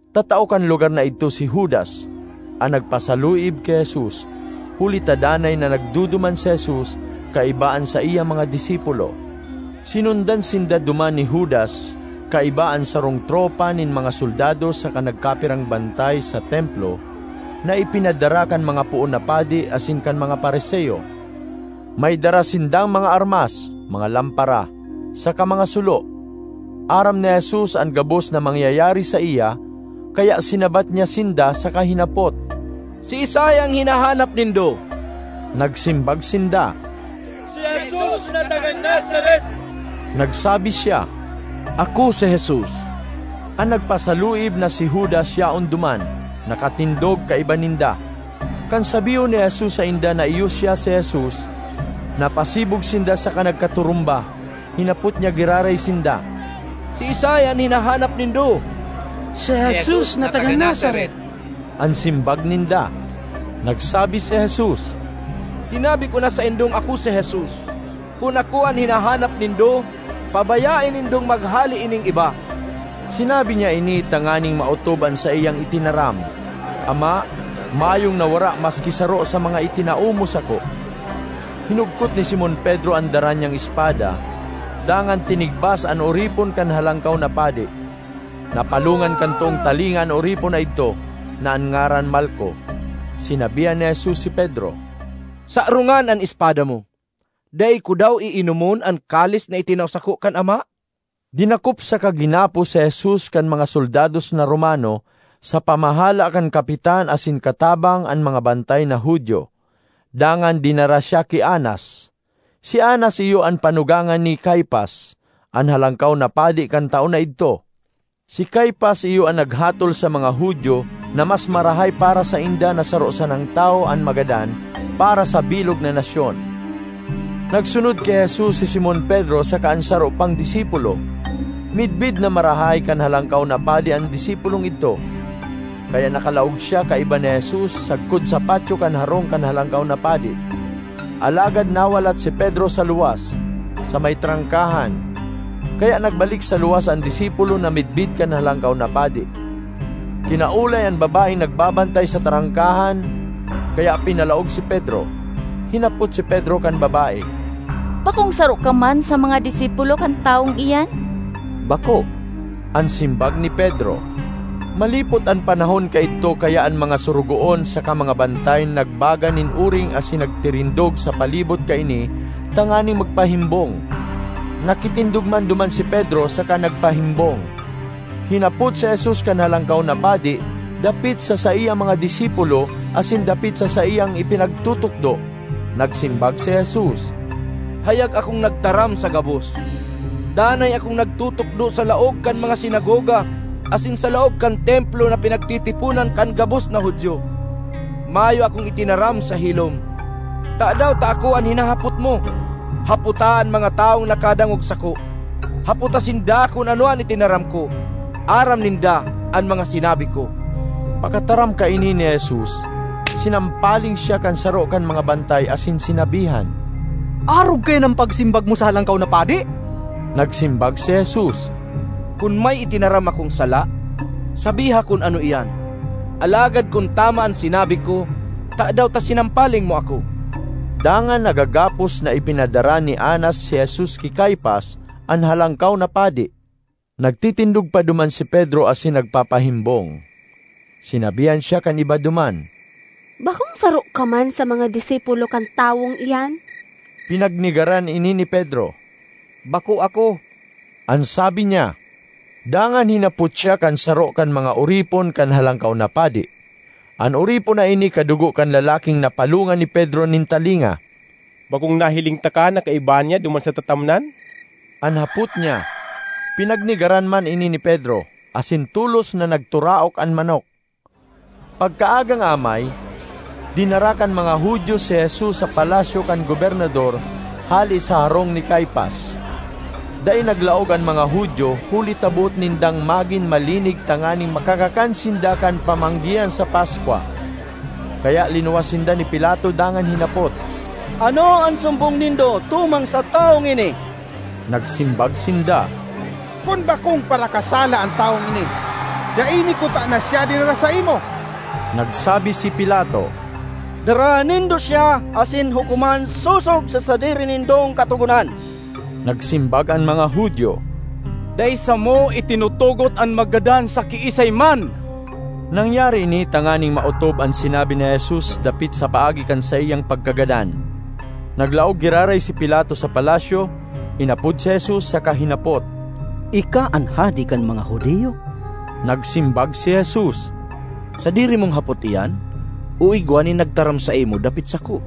Tatao kan lugar na idto si Judas, an nagpasaluib ki Jesus, huli ta danay na nagduduman si Jesus kaiba an saiyang mga disipulo. Sinundan sinda duman ni Judas kaiba an sarong tropa nin mga soldados saka nagkapirang bantay sa Templo na ipinadara kan mga poon na padi asin kan mga Fariseo. May dara sindang mga armas, mga lampara, saka mga sulo. Aram ni Jesus an gabos na mangyayari saiya, kaya sinabat niya sinda saka hinapot, “Siisay an hinahanap nindo?” Nagsimbag sinda, “Si Jesus na taga Nazaret.” Nagsabi siya, “Ako si Jesus!” An nagpasaluib na si Judas yaon duman nakatindog kaiba ninda. Kan sabihon ni Jesus sainda na iyo siya si Jesus, napasibog sinda saka nagkaturumba. Hinapot niya giraray sinda, “Siisay an hinahanap nindo?” “Si Jesus na taga Nazaret,” an simbag ninda. Nagsabi si Jesus, “Sinabi ko na saindong ako si Jesus. Kun ako an hinahanap nindo, pabayae nindong maghale ining iba.” (Sinabi niya ini tanganing maotob an saiyang itinaram, “Ama, mayong nawara maski saro sa mga itinao mo sako.”) Hinugkot ni Simon Pedro an dara niyang espada, dangan tinigbas an oripon kan Halangkaw na Padi. Napalongan kan toong talinga an oripon na idto, na an ngaran Malco. Sinabihan ni Jesus si Pedro, “Sarongan an espada mo! Dai ko daw iinomon an kalis na itinao sako kan Ama?” Dinakop saka ginapos si Jesus kan mga soldados na Romano sa pamahala kan kapitan asin katabang an mga bantay na Judio, dangan dinara siya ki Anas. Si Anas iyo an panugangan ni Caifas, an Halangkaw na Padi kan taon na idto. Si Caifas iyo an naghatol sa mga Judio na mas marahay para sainda na saro sanang tawo an magadan para sa bilog na nasyon. Nagsunod ki Jesus si Simon Pedro saka an saro pang disipulo. Midbid na marahay kan Halangkaw na Padi an disipulong idto, kaya nakalaog siya kaiba ni Jesus sagkod sa patyo kan harong kan Halangkaw na Padi. Alagad nawalat si Pedro sa luwas, sa may trangkahan. Kaya nagbalik sa luwas an disipulo na midbid kan Halangkaw na Padi, kinaolay an babaeng nagbabantay sa trangkahan, kaya pinalaog si Pedro. Hinapot si Pedro kan babae, “Bakong saro ka man sa mga disipulo kan tawong iyan?” “Bako,” an simbag ni Pedro. Malipot an panahon kaidto kaya an mga sorogoon saka mga bantay nagbaga nin oring asin nagtirindog sa palibot kaini tanganing magpahimbong. Nakitindog man duman si Pedro saka nagpahimbong. Hinapot si Jesus kan Halangkaw na Padi dapit sa saiyang mga disipulo asin dapit sa saiyang ipinagtutukdo. Nagsimbag si Jesus, “Hayag akong nagtaram sa gabos; danay akong nagtutukdo sa laog kan mga sinagoga asin sa laog kan Templo na pinagtitiponan kan gabos na Judio. Mayo akong itinaram sa hilom. Tadaw ta ako an hinahapot mo? Hapota an mga tawong nakadangog sako. Hapota sinda kun ano an itinaram ko. Aram ninda an mga sinabi ko.” Pakataram kaini ni Jesus, sinampaling siya kan saro kan mga bantay asin sinabihan, “Arog kaiyan an pagsimbag mo sa Halangkaw na Padi?” Nagsimbag si Jesus, “Kun may itinaram akong sala, sabiha kun ano iyan! Alagad kun tama an sinabi (ko), tadaw ta sinampaling mo ako?” Dangan nagagapos na ipinadara ni Anas si Jesus ki Caifas, an Halangkaw na Padi. Nagtitindog pa duman si Pedro asin nagpapahimbong. Sinabihan siya kan iba duman, “Bakong saro ka man sa mga disipulo kan tawong iyan?” Pinagnegaran ini ni Pedro. “Bako ako,” an sabi niya. Dangan hinapot siya kan saro kan mga oripon kan Halangkaw na Padi. An oripon na ini kadugo kan lalaking napalongan ni Pedro nin talinga. “Bakong nahiling taka na kaiba niya duman sa tatamnan?” an hapot niya. Pinagnegaran man ini ni Pedro; asin tolos na nagturaok an manok. Pagkaagang amay, dinara kan mga Judio si Jesus sa palasyo kan gobernador hale sa harong ni Caifas. Dai naglaog an mga Judio huli ta boot nindang magin malinig tanganing makakakan sinda kan pamanggihan sa Paskwa. Kaya linuwas sinda ni Pilato dangan hinapot, “Ano an sumbong nindo tumang sa tawong ini?” Nagsimbag sinda, “Kun bakong parakasala an tawong ini, dai mi kutana siya dinara saimo.” Nagsabi si Pilato, “Daraha nindo siya, asin hukoman sosog sa sadiri nindong katogonan.” Nagsimbag an mga Judio, “Dai samo itinutugot an maggadan sa kiisay man.” (Nangyari ini tanganing maotob an sinabi ni Jesus dapit sa paagi kan saiyang pagkagadan.) Naglaog giraray si Pilato sa palasyo, inapod si Jesus saka hinapot, “Ika an hade kan mga Judio?” Nagsimbag si Jesus, “Sadiri mong hapot iyan o igwa nin nagtaram saimo dapit sako?”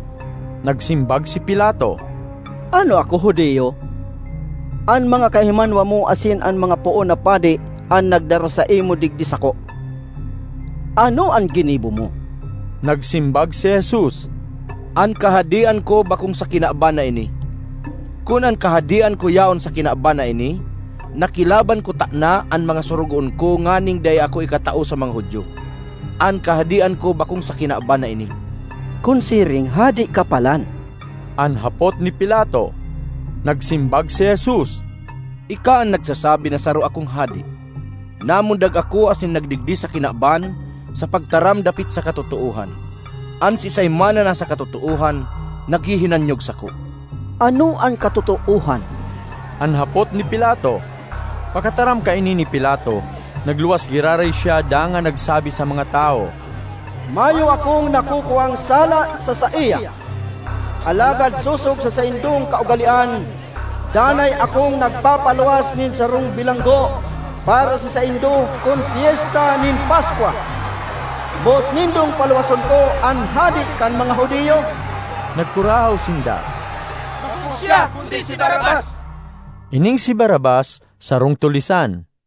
Nagsimbag si Pilato, “Ano ako, Judio? An mga kahimanwa mo asin an mga poon na padi an nagdara saimo digdi sako. Ano an ginibo mo?” Nagsimbag si Jesus, “An kahadean ko bakong sa kinaban na ini. Kun an kahadean ko yaon sa kinaban na ini, nakilaban kutana an mga sorogoon ko nganing dai ako ikatao sa mga Judio. An kahadean ko bakong sa kinaban na ini!” ”Kun siring, hade ka palan?” an hapot ni Pilato. Nagsimbag si Jesus, “Ika an nagsasabi na saro akong hade. Namundag ako asin nagdigdi sa kinaban sa pagtaram dapit sa katotoohan. An siisay man na nasa katotoohan naghihinanyog sako.” ”Ano an katotoohan?” an hapot ni Pilato. Pakataram kaini ni Pilato, nagluwas giraray siya dangan nagsabi sa mga tawo, “Mayo akong nakukuang sala sa saiya. Alagad sosog sa saindong kaugalean, danay akong nagpapaluwas nin sarong bilanggo para sa saindo kun Pyesta nin Paskwa. Boot nindong paluwason ko an hade kan mga Judio?” Nagkurahaw sinda, “Bakong siya kundi si Barrabas!” (Ining si Barrabas sarong tulisan.)